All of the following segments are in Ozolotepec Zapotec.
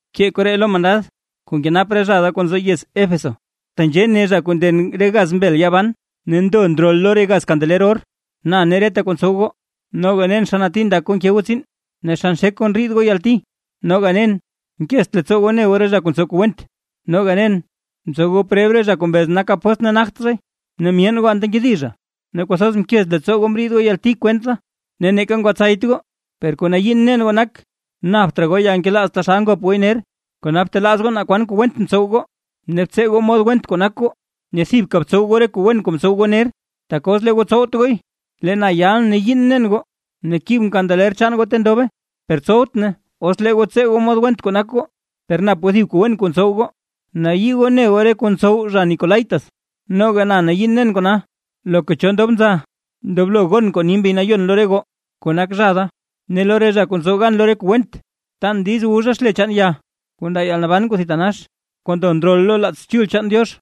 ’Bkee koree lo mandad kuu nkenap re zha da kuu nzo yez Éfeso: “Tenzhee ne zha kuu nden re gaz mbel yaa ban ne ndo ndrol lo re gaz kandeler or: Na ne reta kuu ntsow goo; noga nen xa nati ndak goo nke goo tsiin, ne xa nxek goo ndriid goo yalti, noga nen nkezt leettsoo goo ne goo re zha kuu ntsow kuu went. Ne noga nen mtsow goo preb re zha kuu mbez nak apóstl ne nagt zhay, ne myeen goo anta nkedi zha. Ne kwathoz mkez leettsoo goo mriid goo yalti kwent da, ne neeka ngwatsayt goo. Per kuu nayiin nen goo nak, napt raa goo yalnkelaaz taxal ngop gooy ner. Kona btelaaz goo naa kwan kuu went mtsow goo, ne btsee goo mod went kuu nak goo, ne thibka btsow goo re kuu wen kuu mtsow goo ner. Tak os lee goo tsowt gooy, lee na yal ne yiin nen goo ne kibʼn kandeler chaan goo ta ndobe, per tsowt nay os lee goo tsee goo mod went kuu nak goo. Per nap goo thib kuu wen kuu ntsow goo, nayii goo ne goo re kuu ntsow re zha nicolaítas, noga na nayiin nen kona. Loka cho ndob nza, ndoblo gon kuu ni Mbi Nayon lo re goo, kuu nak zha da: Ne lo re zha kuu tsow gan lo re kuu went, tan diiz wu zha xle chaan ya kuu ndaa yalnaban kuu thitanax, kuu ndo ndrol lo laats Chul chaan Diox.”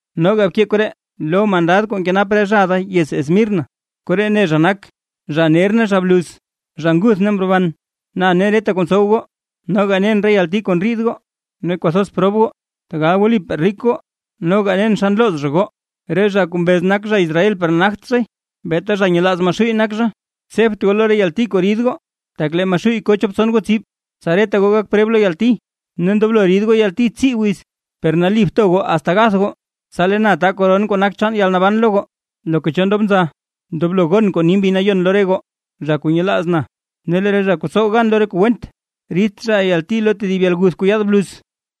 ’Noga bkee koree lo mandad kuu nkenap re zha da yez Esmirna: “Koree ne zha nak, zha ner ne zha bluz, zha nguth ne mroban: Na ne reta kuu ntsow goo; noga nen re yalti kuu ndriid goo ne kwathoz prob goo, tegal wlipaa rik goo. Noga nen xa nlooz zha goo, re zha kuu mbez nak zha Israel per nagt zhay, beeta zha nyelaaz Maxuuy nak zha. Tsebt goo lo re yalti kuu rid goo; tak lee Maxuuy ko chop tson goo tsib; tsa reta goo gak preb lo yalti; ne ndoblo rid goo yalti tsii wiz. Per nali bto goo asta gath goo, tsa lee na ta koron kuu nak chaan yalnaban lo goo. Loka cho ndob nza, ndoblo gon kuu ni Mbi Nayon lo re goo, zha kuu nyelaaz na: Ne lee re zha kuu tsow gan lo re kuu went, ridt zha yalti lo tedib yalguth kuu yaad bluz.”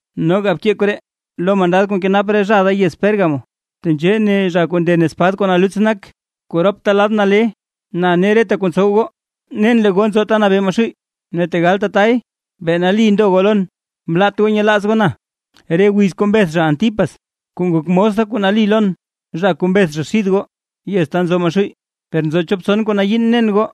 ’Noga bkee koree lo mandad kuu nkenap re zha da yez Pérgamo: “Tenzhee ne zha kuu nden espad kuu naluts nak kuu rop ladta nale: Na ne reta kuu ntsow goo, nen lee goo nzo ta nabee Maxuuy, ne tegal tatay, bee nali ndo goo lon. Mlaat goo nyelaaz goo na, re wiz kuu mbeth zha Antipas kuu ngok mos da kuu nali lon, zha kuu mbeth zha xid goo, yez ta nzo Maxuuy. Per nzo chop tson kuu nayiin nen goo: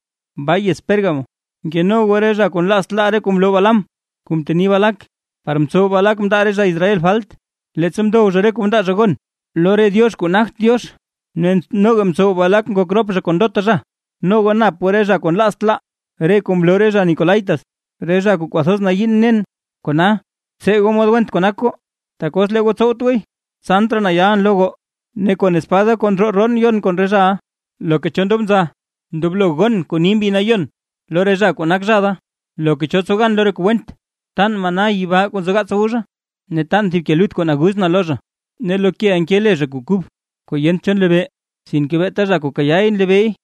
baa yez Pérgamo, nkeno goo re zha kuu nlaazt laa re kuu mloo Balaam kuu mteni Balac, par mtsow Balac mndaa re zha Israel falt, leettsa mdow zha re kuu mndaa zha gon lo re diox kuu nagt Diox, ne noga mtsow Balac ngok rop zha kon ndota zha. Noga nap goo re zha kuu nlaazt laa re kuu mloo re zha nicolaítas, re zha kuu kwathoz nayiin nen. Kona, btsee goo mod went kuu nak goo; tak os lee goo tsowt gooy, tsant raa na yalʼn lo goo, ne kon espad da kuu ndroo roon yon kon re zhaʼa. Loka cho ndob nza, ndoblo gon kuu ni Mbi Nayon lo re zha kuu nak zha da: Loka cho tsow gan lo re kuu went, tan maná yibaa kuu nzogaats wu zha; ne tan thib ke lut kuu naguz na lo zha, ne lo keʼa nke le zha kuu kub kuu yent cho nlebee, sinke beeta zha kuu kayaay nlebeey.”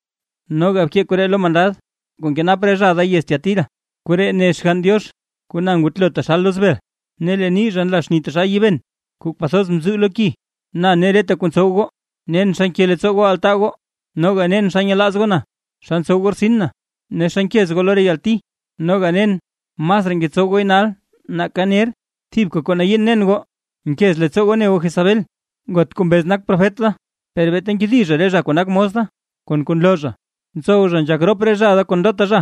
’Noga bkee koree lo mandad kuu nkenap re zha da yez Tiatira: “Koree ne Xgann Diox kuu na ngutlo taxal loz bel ne lee nii zha nla xni taxal yiiben kuu kwathoz mzuu lo ki: Na ne reta kuu ntsow goo; nen xa nke leettsoo goo altaa goo, noga nen xa nyelaaz goo na, xa ntsow goo rtsin na, ne xa nkez goo lo re yalti, noga nen masraa ngetsow gooy nal nake ner. Thibka kuu nayiin nen goo; nkez leettsoo goo ne goo Jezabel, ngot kuu mbez nak profet da, per beeta nkedi zha re zha kuu nak mos da kon re kuu nloo zha, ntsow zha nzhak rop re zha da kon ndota zha,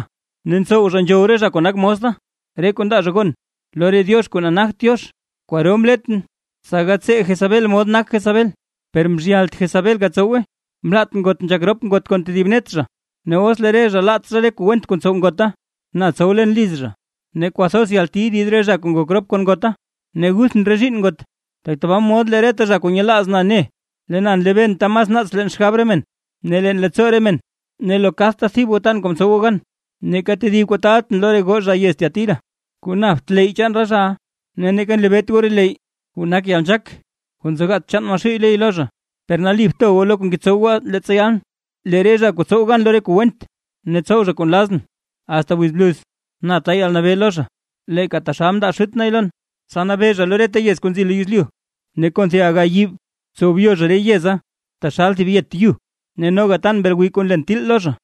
ne ntsow nzhow re zha kuu nak mos da, re kuu ndaa zha gon lo re diox kuu nagt Diox. Kwaro mletʼn, tsa gatsee Jezabel mod nak Jezabel, per mzhyalt Jezabel gatsowe; mlaat ngot nzhak rop ngot kon tedib net zha. Ne os lee re zha laat zha re kuu went kuu ntsow ngota, na tsow len liz zha; ne kwathoz yalti rid re zha kuu ngok rop kon ngota, ne guthʼn re zhiinn ngot. Tbaa mod lee reta zha kuu nyelaaz na ne, lee na nlebeen ta mas naats leen xgab re men ne leen leettsoo re men; ne lo kadta thib goo tan kuu mtsow goo gan. Neeka tedib kuu taaltʼn lo re goo zha yez Tiatira, kuu napt leyy chaan re zhaʼa, ne neeka nlebeet goo re leyy, kuu nak yalnzhaak kuu nzogaats chaan Maxuuy ley lo zha. Per nali bto goo lo kuu ngetsow goo asta leettsa yalʼn. Lee re zha kuu tsow gan lo re kuu went, ne tsow zha kuu nlazʼn asta wiz bluz, na ta yalnabee lo zha, leeka taxal mndaa Xut nay lon, tsa nabee zha lo reta yez kuu nzi lo yezlyu. Ne kon thib aga yiib tsow byo zha re yeza taxal thib yet yu. Ne noga tan mbel gwiiy kuu nlen til lo zha.